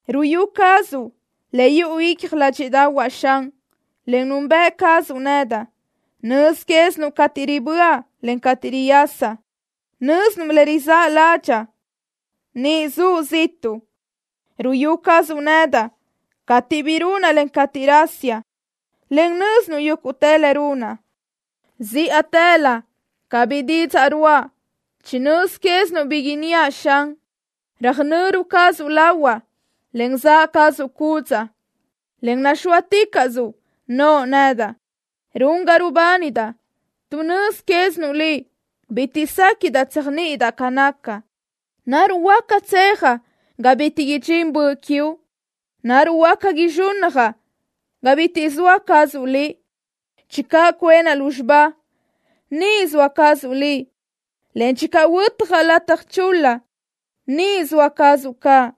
Ruyú cazuʼ le yuʼu icja ládxiʼdaʼahuaʼ, Xan, en nunbëʼ cazuʼ nedaʼ. Nöz quézinuʼ cateʼ riböʼa, en cateʼ riyasaʼ. Nö́zinuʼ le rizáʼ ládxaʼa niʼ zuʼ ziʼtuʼ. Ruyú cazuʼ nedaʼ cateʼ bi runaʼ, en cateʼ rasiaʼ, en nö́zinuʼ yúguʼtë le runaʼ. Zíʼatëlö ca bi didzaʼ ruʼa, chi nöz quézinuʼ bi inníaʼ, Xan. Röjnöru cazuʼ lahuaʼ, en zaʼ cazuʼ cúdzaʼa, en naxóaticaʼsö noʼo nedaʼ. Run ga rubánidaʼ tuʼ nöz quézinuʼ Liʼ. Bitiʼ séquiʼdaʼ tséajniʼidaʼ ca naca. ¿Naruʼ huáca tsejaʼ ga bitiʼ idxín Böʼ quiuʼ? ¿Naruʼ huáca izxúnnajaʼ ga bitiʼ zoa cazuʼ Liʼ? Laʼtuʼ huabenaʼ lúzxiba, niʼ soa cazuʼ Liʼ, en laʼtuʼ huötjaʼ lataj chul-la, niʼ zoa cazuʼ caʼ.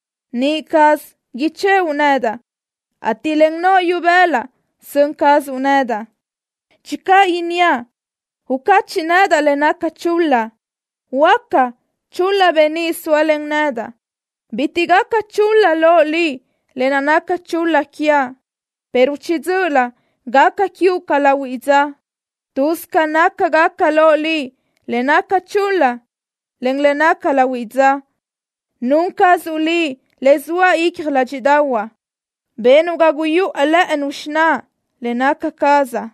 niʼ caz ichëʼu nedaʼ, ateʼ len noʼo ibëla sön cazuʼ nedaʼ. Laʼtuʼ inníaʼ: “Ucachiʼ nedaʼ le naca chul-la”, en laʼtuʼ huöáca chul-la beníʼ zóalen nedaʼ, bitiʼ gaca chul-la loʼ Liʼ lë naʼ naca chul-la quiaʼ, pero chiʼi dzö́ʼölö gaca quiuʼ ca lahuiʼ dza. Tuz ca nácagaca loʼ Liʼ le naca chul-la, en le naca lahuiʼ dza. Nun cazuʼ Liʼ le zoa icja ládxiʼdaʼahuaʼ. Benuʼ ga guyáʼ lë́ʼënu xináʼa le naca cazaʼ.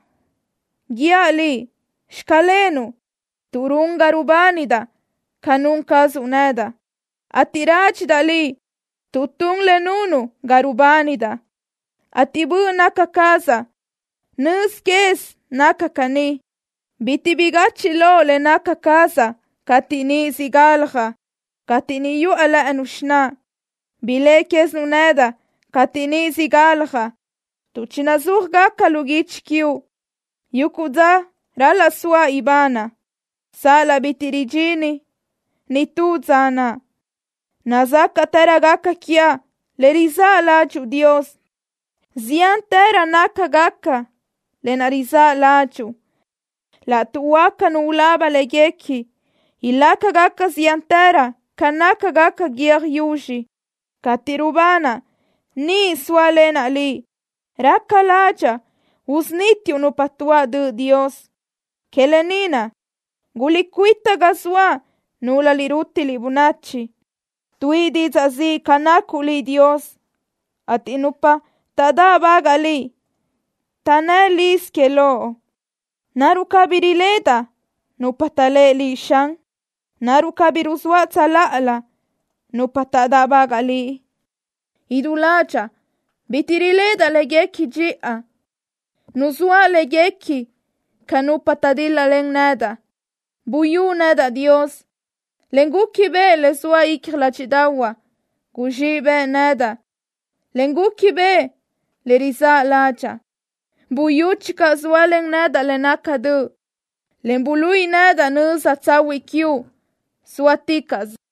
Guíaʼ Liʼ: “Xclenuʼ” tuʼ run ga rubánidaʼ ca nun cazuʼ nedaʼ, ateʼ rádxidaʼ Liʼ tuʼ tun le nunuʼ ga rubánidaʼ, ateʼ böʼ naca cazaʼ nözi caz naca caní. Bitiʼ bigachiʼ loʼ le naca cazaʼ cateʼ niʼ siʼ galjaʼ, cateʼ niʼ yuʼa lë́ʼënu xináʼa. Biléʼe quézinuʼ nedaʼ cateʼ niʼ siʼ galjaʼ, tuʼ chinuzúajgaca lu guichi quiuʼ yuguʼ dza ral-laʼ soaʼ ibanaʼ, sal-laʼ bitiʼ ridxini nitú dza naʼ. Nazácaʼtërögaca quiaʼ le rizáʼ ládxuʼu, Dios. Ziántërö nácagaca lë naʼ rizáʼ ládxuʼu. Laʼtuʼ huáca nu ulaba léguequi, ilácagaca ziántërö ca nácagaca guiö́j yuzxi. Cateʼ rubanaʼ, niʼ zóalenaʼ Liʼ. Raca ládxaʼa usunítiuʼ nupa tuáʼ döʼ, Dios. Que lë ni naʼ, guliʼcuíta ga zoaʼ, núlöliʼ rútiliʼ bönachi. Tuíʼi didzaʼ ziʼ ca nacuʼ Liʼ, Dios, ateʼ nupa taʼdáʼbagaʼ Liʼ taʼnnë́ liz que Loʼ. ¿Naruʼ cabí riledaʼ nupa taʼlé Liʼ, Xan? ¿Naruʼ cabí ruzóaʼ tsöláʼalö nupa taʼdáʼbagaʼ Liʼ? Idú ládxaʼa bitiʼ riléʼedaʼ léguequi dxiʼa. Nuzóaʼ léguequi ca nupa taʼdíl-lalen nedaʼ. Buyú nedaʼ, Dios, en gúquibeʼe le zoa icja ládxiʼdaʼahuaʼ. Guzxíʼ bëʼ nedaʼ, en gúquibeʼe le rizáʼ ládxaʼa. Buyú channö zóalen nedaʼ le naca döʼ, en buluíʼi nedaʼ nöza tsahuiʼ quiuʼ zóaticaʼsö.